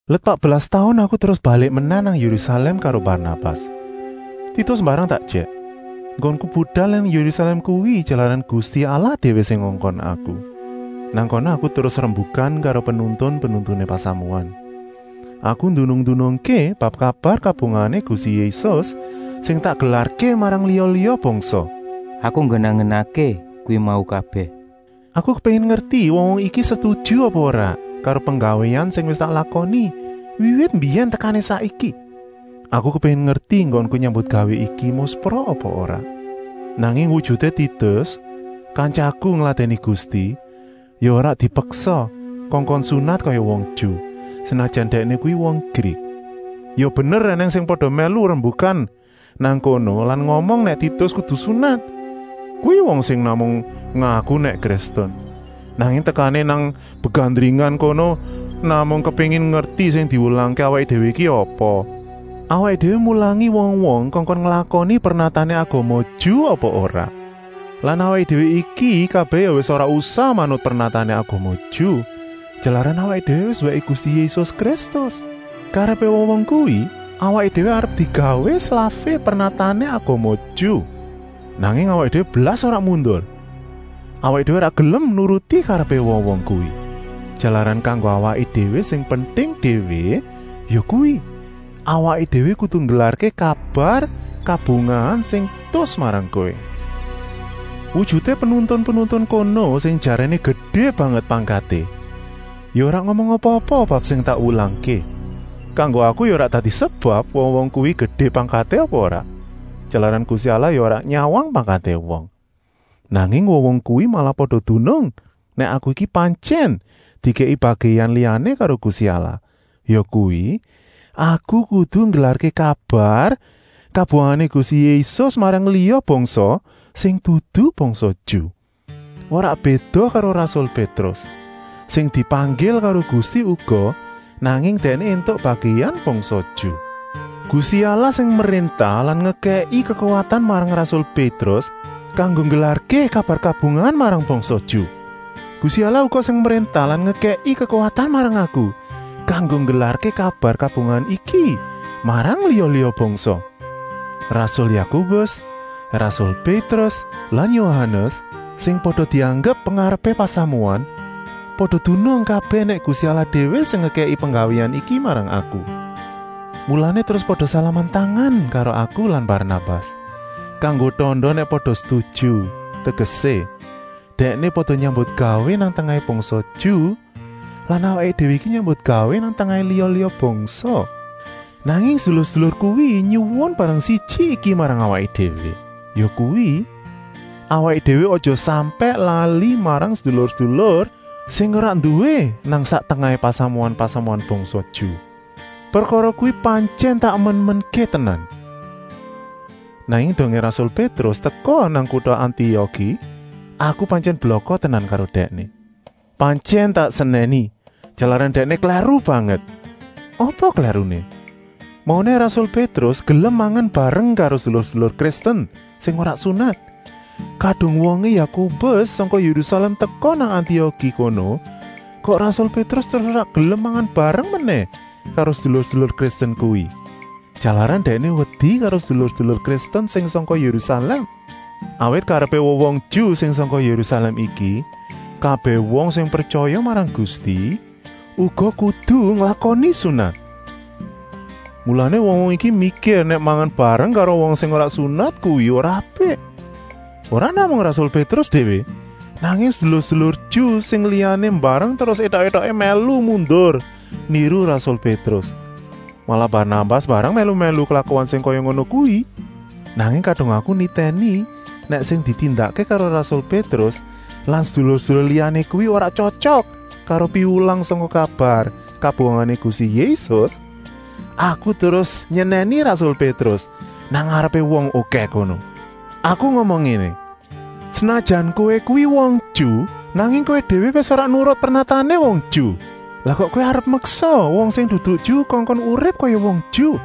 Let patbelas taun aku terus balik menèh nang Yérusalèm karo Barnabas. Titus mbarang tak ejèk. Enggonku budal nang Yérusalèm kuwi jalaran Gusti Allah déwé sing ngongkon aku. Nang kana aku terus rembukan karo penuntun-penuntuné pasamuan. Aku ndunung-ndunungké bab kabar kabungahané Gusti Yésus sing tak gelarké marang liya-liya bangsa. Aku nggenah-nggenahké kuwi mau kabèh. Aku kepéngin ngerti wong-wong iki setuju apa ora karo penggawéan sing wis tak lakoni wiwit mbiyèn tekané saiki. Aku kepéngin ngerti enggonku nyambutgawé iki muspra apa ora. Nanging wujuté Titus, kantyaku ngladèni Gusti, ya ora dipeksa kongkon sunat kaya wong Ju, senajan dèkné kuwi wong Grik. Ya bener ènèng sing pada mèlu rembukan nang kono lan ngomong nèk Titus kudu sunat. Kuwi wong sing namung ngaku nèk Kristen, nanging tekané nang begandringan kono namung kepéngin ngerti sing diwulangké awaké déwé iki apa: awaké déwé mulangi wong-wong kongkon nglakoni pernatané agama Ju apa ora. Lan awaké déwé iki kabèh ya wis ora usah manut pernatané agama Ju, jalaran awaké déwé wis wèké Gusti Yésus Kristus. Karepé wong-wong kuwi awaké déwé arep digawé slafé pernatané agama Ju. Nanging awaké déwé blas ora mundur. Awaké déwé ora gelem nuruti karepé wong-wong kuwi, jalaran kanggo awaké déwé sing penting déwé yakuwi: awaké déwé kudu nggelarké kabar kabungahan sing tus marang kowé. Wujuté penuntun-penuntun kono, sing jaréné gedé banget pangkaté, ya ora ngomong apa-apa bab sing tak wulangké. Kanggo aku ya ora dadi sebab wong-wong kuwi gedé pangkaté apa ora, jalaran Gusti Allah ya ora nyawang pangkaté wong. Nanging wong-wong kuwi malah pada dunung nèk aku iki pantyèn dikèki bagèan liyané karo Gusti Allah, yakuwi: aku kudu nggelarké kabar kabungahané Gusti Yésus marang liya bangsa, sing dudu bangsa Ju. Ora béda kaya rasul Pétrus, sing dipanggil karo Gusti uga, nanging dèkné éntuk bagèan bangsa Ju. Gusti Allah sing mréntah lan ngekèki kekuwatan marang rasul Pétrus kanggo nggelarké kabar kabungahan marang bangsa Ju, Gusti Allah uga sing mréntah lan ngekèki kekuwatan marang aku kanggo nggelarké kabar kabungahan iki marang liya-liya bangsa. Rasul Yakobus, rasul Pétrus, rasul lan Yohanes, sing pada dianggep pengarepé pasamuan, pada dunung kabèh nèk Gusti Allah déwé sing ngekèki penggawéan iki marang aku. Mulané terus pada salaman tangan karo aku lan Barnabas, kanggo tanda nèk pada setuju, tegesé, dèkné pada nyambutgawé nang tengahé bangsa Ju lan awaké déwé iki nyambutgawé nang tengahé liya-liya bangsa. Nanging sedulur-sedulur kuwi nyuwun barang siji iki marang awaké déwé, yakuwi, awaké déwé aja sampèk lali marang sedulur-sedulur sing ora nduwé nang sak tengahé pasamuan-pasamuan bangsa Ju. Prekara kuwi ya pantyèn tak emen-emenké tenan. Nanging dongé rasul Pétrus teka nang kuta Antioki aku pantyèn blaka tenan karo dèkné. Pantyèn tak senèni, jalaran dèkné klèru banget. Apa klèruné? Mauné rasul Pétrus gelem mangan bareng karo sedulur-sedulur Kristen sing ora sunat. Kadung wongé Yakobus sangka Yérusalèm teka nang Antioki kono kok rasul Pétrus terus ora gelem mangan bareng menèh karo sedulur-sedulur Kristen kuwi. Jalaran dèkné wedi karo sedulur-sedulur Kristen sing sangka Yérusalèm. Awit karepé wong-wong Ju sing sangka Yérusalèm iki, kabèh wong sing pretyaya marang Gusti uga kudu nglakoni sunat. Mulané wong-wong iki mikir nèk mangan bareng karo wong sing ora sunat kuwi ora apik. Ora namung rasul Pétrus déwé, nanging sedulur-sedulur Ju sing liyané mbarang terus étok-étoké mèlu mundur niru rasul Pétrus. Malah Barnabas mbarang mèlu-mèlu klakuan sing kaya ngono kuwi. Nanging kadung aku nitèni nèk sing ditindakké karo rasul Pétrus lan sedulur-sedulur liyané kuwi ora tyotyok karo piwulang sangka kabar kabungahané Gusti Yésus, aku terus nyenèni rasul Pétrus nang ngarepé wong okèh kono. Aku ngomong ngéné: “Senajan kowé kuwi wong Ju, nanging kowé déwé wis ora nurut pernatané wong Ju. Lah kok kowé arep meksa wong sing dudu Ju kongkon urip kaya wong Ju.”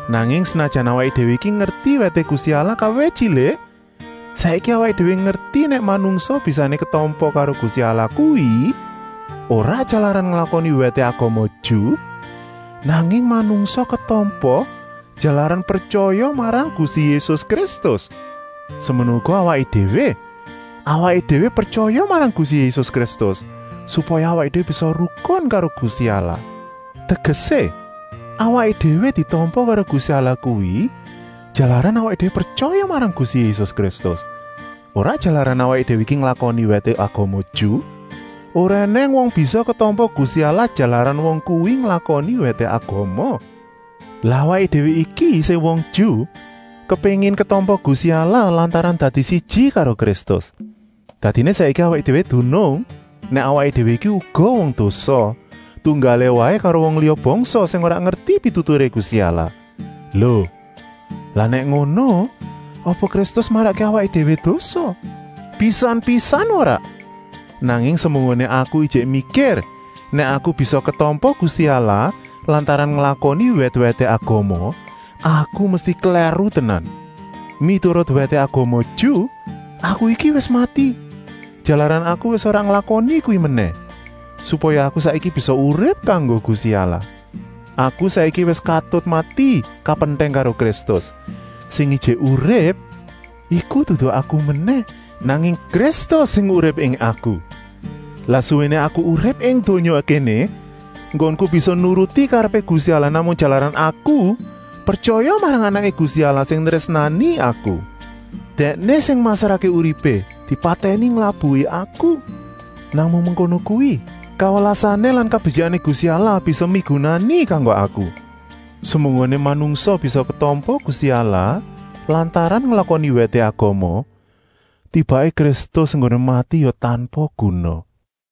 Nanging senajan awaké déwé iki ngerti wèté Gusti Allah kawit tyilik, saiki awaké déwé ngerti nèk manungsa bisané ketampa karo Gusti Allah kuwi ora jalaran nglakoni wèté agama Ju, nanging manungsa ketampa, jalaran pretyaya marang Gusti Yésus Kristus. Semono uga awaké déwé, awaké déwé pretyaya marang Gusti Yésus Kristus supaya awaké déwé bisa rukun karo Gusti Allah. Tegesé, awaké déwé ditampa karo Gusti Allah kuwi jalaran awaké déwé pretyaya marang Gusti Yésus Kristus, ora jalaran awaké déwé iki nglakoni wèté agama Ju. Ora ènèng wong bisa ketampa Gusti Allah jalaran wong kuwi nglakoni wèté agama. Lah awaké déwé iki sing wong Ju kepéngin ketampa Gusti Allah lantaran dadi siji karo Kristus. Dadiné saiki awaké déwé dunung nèk awaké déwé iki uga wong dosa, tunggalé waé karo wong liya bangsa sing ora ngerti pituturé Gusti Allah. Lo, lah nèk ngono, apa Kristus marakké awaké déwé dosa? Pisan-pisan ora! Nanging semunggoné aku ijik mikir nèk aku bisa ketampa Gusti Allah lantaran nglakoni wèt-wèté agama, aku mesti klèru tenan. Miturut wèté agama Ju aku iki wis mati, jalaran aku wis ora nglakoni kuwi menèh, supaya aku saiki bisa urip kanggo Gusti Allah. Aku saiki wis katut mati kapentèng karo Kristus, sing ijik urip iku dudu aku menèh, nanging Kristus sing urip ing aku. Lan suwéné aku urip ing donya kéné, enggonku bisa nuruti karepé Gusti Allah namung jalaran aku pretyaya marang Anaké Gusti Allah sing nrésnani aku. Dèkné sing masrahké uripé dipatèni nglabuhi aku. Namung mengkono kuwi kawelasané lan kabetyikané Gusti Allah bisa migunani kanggo aku. Semunggoné manungsa bisa ketampa Gusti Allah lantaran nglakoni wèté agama, tibaké Kristus enggoné mati ya tanpa guna.